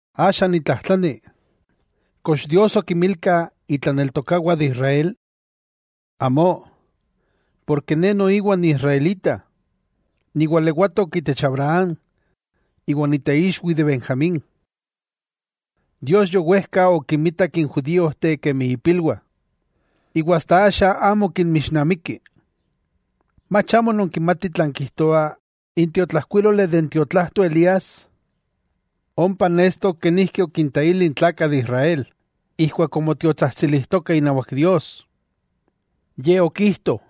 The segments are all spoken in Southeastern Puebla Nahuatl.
Axa, nitlajtlani: ¿Kox Dios okinmilka itlaneltokawah de Israel? ¡Amó! Porke ne noiwa niisraelita, niwalewatok itech Abraham iwa niteixwi de Benjamín. Dios yowejka okinmitak n judíojteh kemi ipilwah; iwa asta axa amo kinmixnamiki. ¿Mach amó nonkimatih tlan kijtoa n tiotlajkuíloli de n tiotlajto Elías, ompa nestok kenijki okinteili n tlakah de Israel ijkuak omotiotsajtsilijtoka inawak Dios? Ye okijto: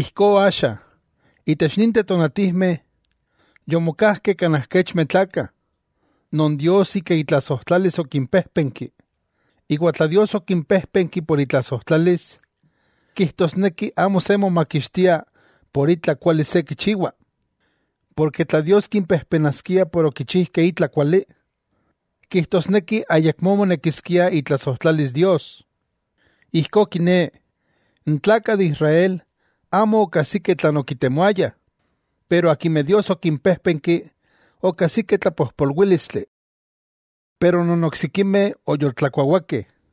Ijkó axa, itech ninteh tonatijmeh, yomokajkeh kanaj kechmeh tlakah, non Dios ika itlasojtlalis okimpéjpenki. Iwa tla Dios okimpéjpenki por itlasojtlalis, kijtosneki amo se momakixtia por itla kuali se kichiwa. Porke tla Dios kimpejpenaskia por okichijkeh itla kuali, kijtosneki ayakmó monekiskia itlasojtlalis Dios. Ijkó kiné, n tlakah de Israel amo okajsikeh tlan okitemoayah, pero akimeh Dios okimpéjpenki okajsikeh tlapojpolwílistli. Pero non oksikimeh oyoltlakuawakeh.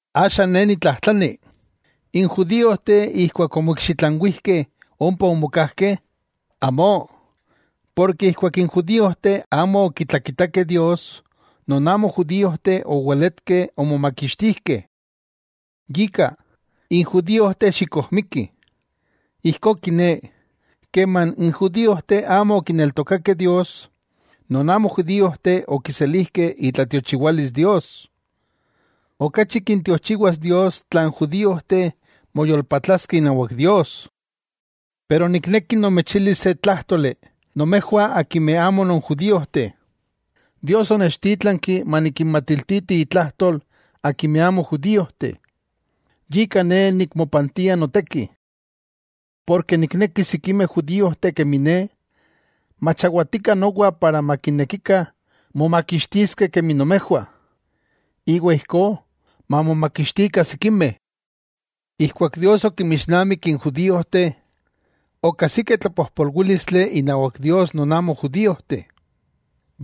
Axa ne nitlajtlani: ¿N judíojteh ijkuak omoikxitlanwijkeh ompa omokajkeh? ¡Amo! Porke ijkuak n judiojteh amo okitlakitakeh Dios, non amo judíojteh oweletkeh omomakixtijkeh. Yika, n judíojteh xikojmikih. Ijkó kiné, keman n judíojteh amo okineltokakeh Dios, non amo judíojteh okiselijkeh itlatiochiwalis Dios. ¡Okachi kintiochiwas Dios tla n judíojteh moyolpatlaskeh inawak Dios! Pero nikneki nomechilis se tlájtoli nomejwah akimeh amo non judíojteh. Dios onechtítlanki manikinmatiltiti itlajtol akimeh amo judíojteh, yika ne nikmopantia noteki. Porke nikneki sikimeh judíojteh kemi ne, machawatikah nomowa para makinekikah momakixtiskeh kemi nomejwah, iwa ijkó mamomakixtikah sikimeh. Ijkuak Dios okinmixnamik n judíojteh, okajsikeh tlapojpolwílistli inawak Dios non amo judíojteh,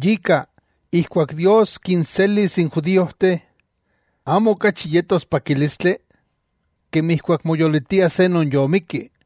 yika, ijkuak Dios kinselis n judíojteh ¿amo okachi yetos pakílistli? Kemi ijkuak moyolitia se non yomikki.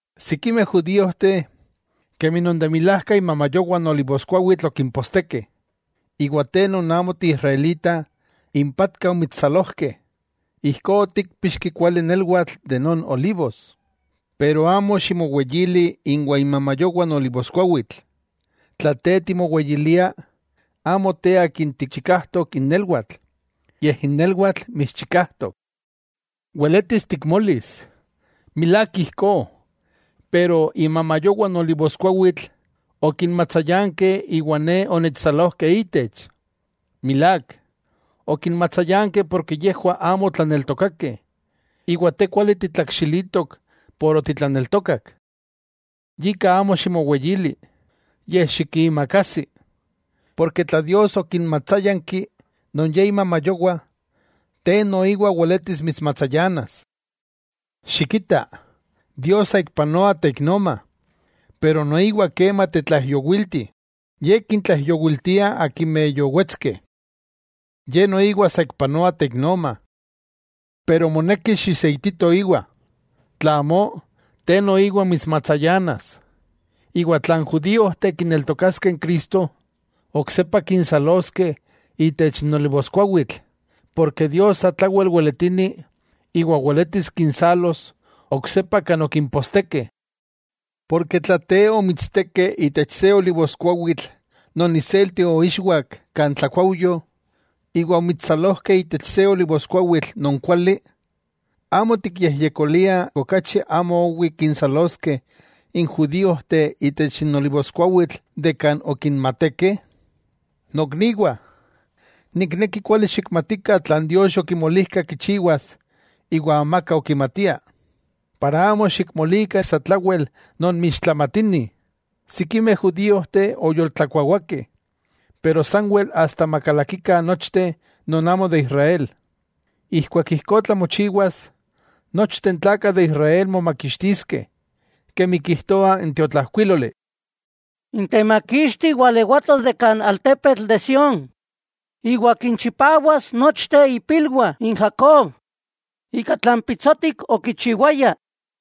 Sikimeh judíojteh, kemi non de milajka imamayowah n olivoskuawitl okimpostekeh, iwa te non amo ti israelita impatka omitssalojkeh. Ijkó otikpixki kuali nelwatl de non olivos. Pero amo ximoweyili inwa imamayowah n olivoskuawitl, tla te timoweyiliah, amo te akin tikchikajtok n nelwatl, yej n nelwatl mitschikajtok. Weletis tikmolis: “Milák ijkó, pero imamayowah n olivoskuawitl okinmatsayankeh iwa ne onechsalokeh ítech.” Milák. Okinmatsayankeh porke yejwah amo otlaneltokakeh, iwa te kuali titlakxilitok por otitlaneltokak. Yika amo ximoweyili, yej xikiimakajsi. Porke tla Dios okinmatsayankih non Ye imamayowah, te noiwa weletis mitsmatsayanas. Xikita, Dios saikpanoa teiknoma, pero noiwa kema tetlaijyowilti. Ye kintlaijyowiltia akimeh yowetskeh. Ye noiwa saikpanoa teiknoma. Pero moneki xiseitito íwa. Tla amó, te noiwa mitsmatsayanas. Iwa tla n judíojteh kineltokaskeh n Cristo, oksepa kinsaloskeh itech n olivoskuawitl, porke Dios satlawel weletini iwa weletis kinsalos oksepa kan okimpostekeh. Porke tla te omitstekeh itech se olivoskuawitl non iselti oixwak kan tlakuaujyo, iwa omitssalojkeh itech se olivoskuawitl non kuali, ¡amo tikyejyekolia okachi amo owi kinsaloskeh n judíojteh itech olivoskuawitl kan okinmatekeh! Nokniwah, nikneki kuali xikmatikah tlan Dios yokimolijka kichiwas iwa amaka okimatia, para amo xikmolikah satlawel nonmixtlamatinih: sikimeh judíojteh oyoltlakuawakeh, pero sanwel asta makalakikah nochteh non amo de Israel. Ijkuak ijkó tlamochiwas, nochteh n tlakah de Israel momakixtiskeh, kemi kijtoa n tiotlajkuíloli: N Temakixti walewatos de kan altepetl de Sión, iwa kinchipawas nochteh ipilwah n Jacob ika tlan pitsotik okichiwayah.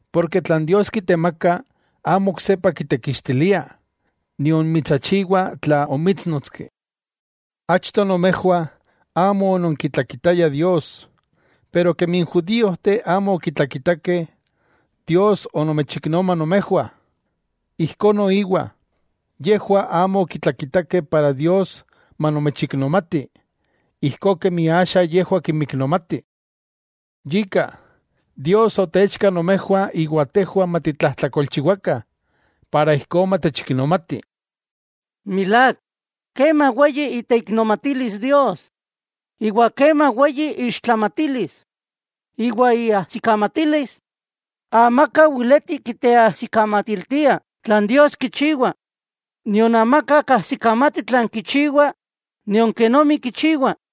Porke tlan Dios kitemaka amo oksepa kitekixtilia, nion mitsachiwa tla omítsnotski. Achto nomejwah, amo ononkitlakitayah Dios, pero kemi n judíojteh amo okitlakitakeh, Dios onomechiknoma nomejwah. Ijkó noiwa, yejwah amo okitlakitakeh para Dios manomechiknomati ijkó kemi axa yejwah kinmiknomati. Yika, Dios otechka nomejwah iwa tejwah matitlajtlakolchiwakah, para ijkó matechiknomati. ¡Milák, kema weyi iteiknomatilis Dios, iwa kema weyi iixtlamatilis! Iwa iajsikamatilis, amaka weleti kiteajsikamatiltia tlan Dios kichiwa, nion amaka kajsikamati tlan kichiwa nion kenomi kichiwa.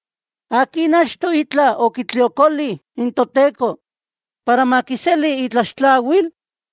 ¿Akin achto itla okitliokoli n Toteko, para makiseli itlaxtlawil?”